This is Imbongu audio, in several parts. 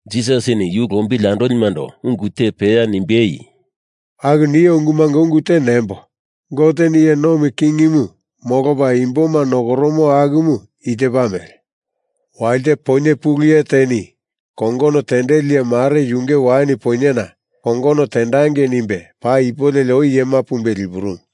Jisasini yu lombili andolimando ungu te peya nimbei, “Aku nio ungumunga ungu te nembo, Goteni iye nomi kingimu molopa imboma nokoromo akumu i tepa mele: Walite poinye pulu iye teni kongono tendeli iye mare yunge wain poinyena kongono tendangei nimbe paa ipu leli oi iyema pumbe lipurumu.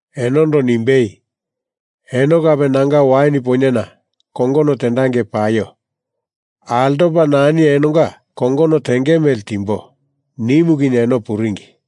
enondo nimbei, ‘Eno kape nanga wain poinyena kongono tendangei paio. Altopa nani enonga kongono tenge mele timbo,’ nimu kinye eno puringi.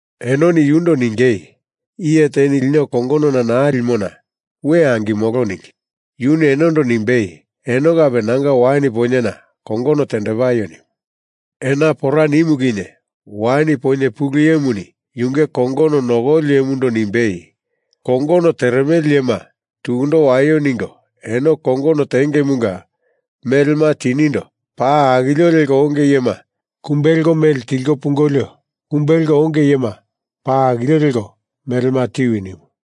Enoni yundo ningei, ‘Iye teni lino kongonona naa limona we angimolo,’ ningi. Yuni enondo nimbei, ‘Eno kape nanga wain poinyena kongono tendepaio,’ nimu. Ena pora nimu kinye wain poinye pulu iyemuni yunge kongono nokoli iyemundo nimbei, ‘Kongono teremele iyema tukundo waio ningo eno kongono tengemunga melema tinindo paa akilio leko onge iyema kumbe leko mele tilko pungolio kumbe leko onge iyema paa akilio leko melema tiwi,’ nimu.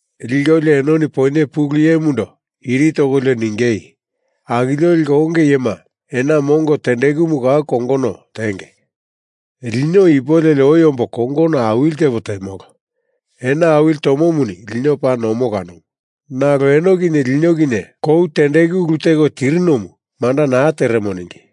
Likolio enoni poinye pulu iyemundo iri tokolio ningei, ‘Akilio leko onge iyema ena mongo tendekumu kou kongono tenge. Lino ipu leli oi ombo kongono awili tepo temolo. Ena awili tomomuni lino paa nomo kanomu, nalo eno kinye lino kinye kou tendeku ulu teko tirinomu, manda naa teremo,’ ningi.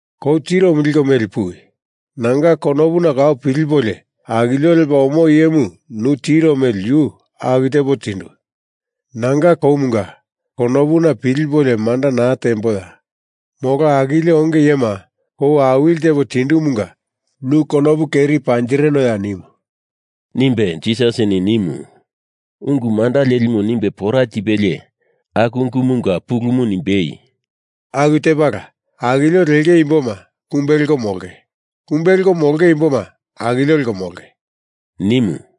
Kou tiromu liko meli puwi. Nanga konopuna kau pilipolio akilio lepa omo iyemu nu tiro mele yu aku tepo tindu. Nanga koumanga konopuna pilipolio manda naa temboya? Molo akilio onge iyema kou awili tepo tindumunga nu konopu keri panjirinoya?’ nimu,” nimbe Jisasini nimu. Ungu manda lelimu nimbe pora tipelie aku ungumunga pulumu nimbei, “Aku tepala, akilio lenge imboma kumbe leko molonge, kumbe leko molonge imboma akilio leko molonge,” nimu.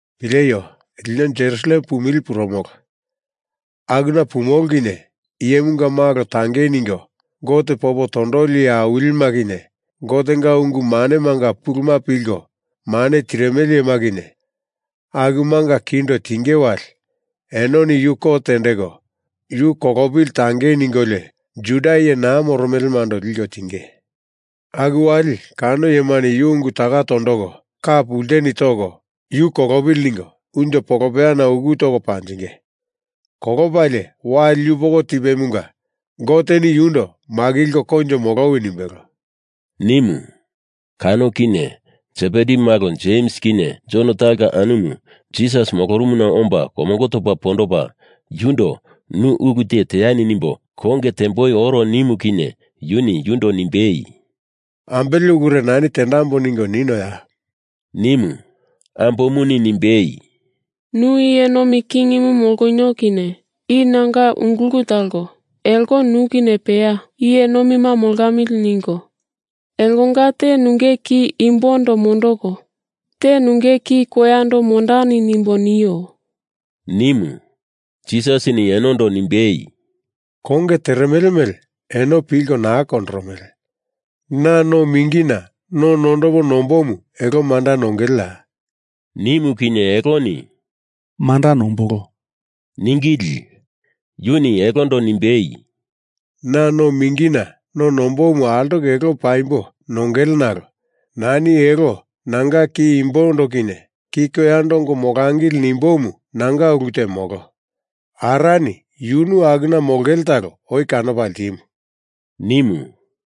“Pileio. Lino Jerusalem pumili purumolo. Akuna pumolo kinye Iyemunga Malo tangei ningo Gote popo tondoli iye awilima kinye, Gotenga ungu manemanga puluma pilko mane tirimele iyema kinye, akumanga kindo tinge wali, enoni yu kot tendeko Yu kolopili tangei ningolio Juda iye naa moromelemando liko tinge. Aku wali kano iyemani yu ungu taka tondoko, ka pulteni toko, yu kolopili ningo unjo polopeyana uku toko panjinge. Kolopalie, wali yupoko tipemunga Goteni yundo makilko koinjo molowi nimbelo,” nimu. Kano kinye Sebedi malo Jems kinye Jon talonga anumu Jisas molorumuna omba komongo topa pondopa yundo nu ulu te teani nimbo konge temboi oro nimu kinye yuni yundo nimbei, “Ambele ulure nani tendambo ningo ninoya?” nimu. Ambomuni nimbei, “Nu iye nomi kingimu molonio kinye i nanga ungulu talo elo nu kinye peya iye nomima molamili ningo elonga te nunge ki imbondo mondoko te nunge ki koyando mondani nimbo nio,” nimu. Jisasini enondo nimbei, “Konge teremele mele eno pilko naa kondoromele. Na no mingina no nondopo nomboimu elo manda nongeleya?” nimu kinye eloni “Manda nombolo,” ningili. Yuni elondo nimbei, “Na no mingina no nombomu altoko elo paimbo nongele nalo nani elo nanga ki imbondo kinye ki koyando ongo molangili nimbomu nanga ulu te molo. Arani yunu akuna molongele talo oi kanopa ltimu,” nimu.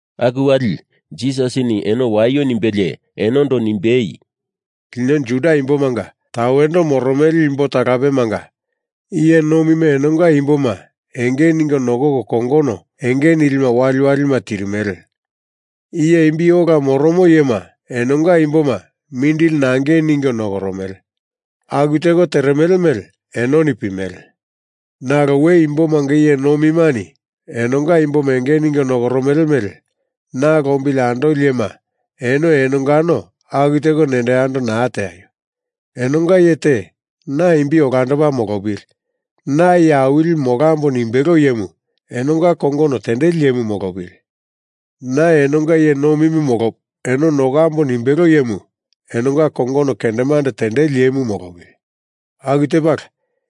Aku wali Jisasini eno waio nimbelie, enondo nimbei, “Lino Juda imbomanga tawendo moromele imbo talapemanga iye nomima enonga imboma enge ningo nokoko kongono enge nilima waliwalima tirimele. Iye imbi ola moromo iyema enonga imboma mindili nangei ningo nokoromele. Aku teko teremele mele enoni pimele. Nalo we imbomanga iye nomimani enonga imboma enge ningo nokoromele mele na lombili andoli iyema eno enongano aku teko nendo yando naa teaio. Enonga iye te na imbi olandopa molopili, na iye awilimu molambo nimbelo iyemu enonga kongono tendeli iyemu molopili. Na enonga iye nomimu molopo eno nokambo nimbelo iyemu enonga kongono kendemande tendeli iyemu molopili. Aku tepala,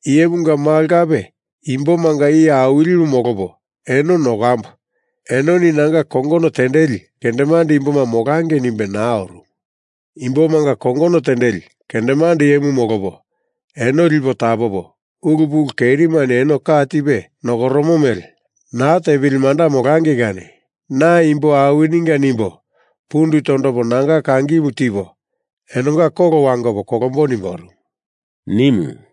Iyemunga Malo kape imbomanga iye awilimu molopo eno nokambo, enoni nanga kongono tendeli kendemande imboma molangei nimbe naa orumu. Imbomanga kongono tendeli kendemande iyemu molopo eno lipo tapopo, ulu pulu kerimani eno ka tipe nokoromo mele naa tepili manda molangei kani na imbo awininga nimbo pundu tondopo nanga kangimu tipo, enonga kolo wangopo kolombo nimbe orumu,” nimu.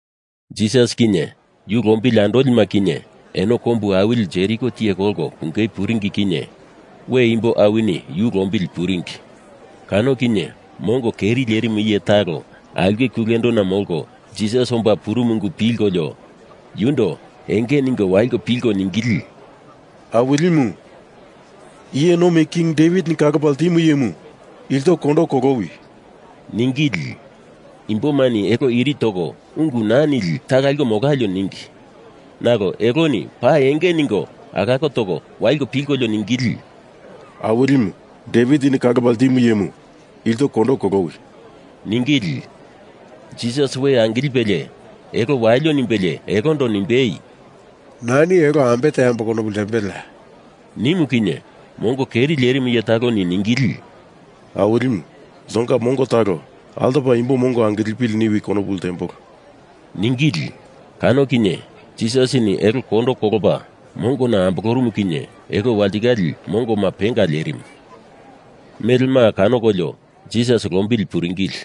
Jisas kinye yu lombili andolima kinye eno kombu awili Jeriko tiye kolko pungei puringi kinye we imbo awini yu lombili puringi. Kano kinye mongo keri lerimu iye talo aulke kulendona molko Jisas omba purumu ungu pilkolio yundo enge ningo waliko pilko ningili, “Awilimu, iye nomi king Devitini kalopa ltimu iyemu, ilto kondo kolowi,” ningili. Imbomani elo iri toko ungu naa nili taka liko molalio ningi. Nalo eloni paa enge ningo alako toko waliko pilkolio ningili, “Awilimu, Devitini kalopa ltimu iyemu, ilto kondo kolowi,” ningili. Jisas we angilipelie elo walio nimbelie elondo nimbei, “Nani elo ambe teambo konopu ltembeleya?” nimu kinye mongo keri lerimu iye taloni ningili, “Awilimu, iltonga mongo talo altopa imbo mongo angilepili niwi konopu ltembolo,” ningili. Kano kinye Jisasini elo kondo kolopa mongona ambolorumu kinye elo walitikale mongoma penga lerimu, melema kanokolio, Jisas lombili puringili.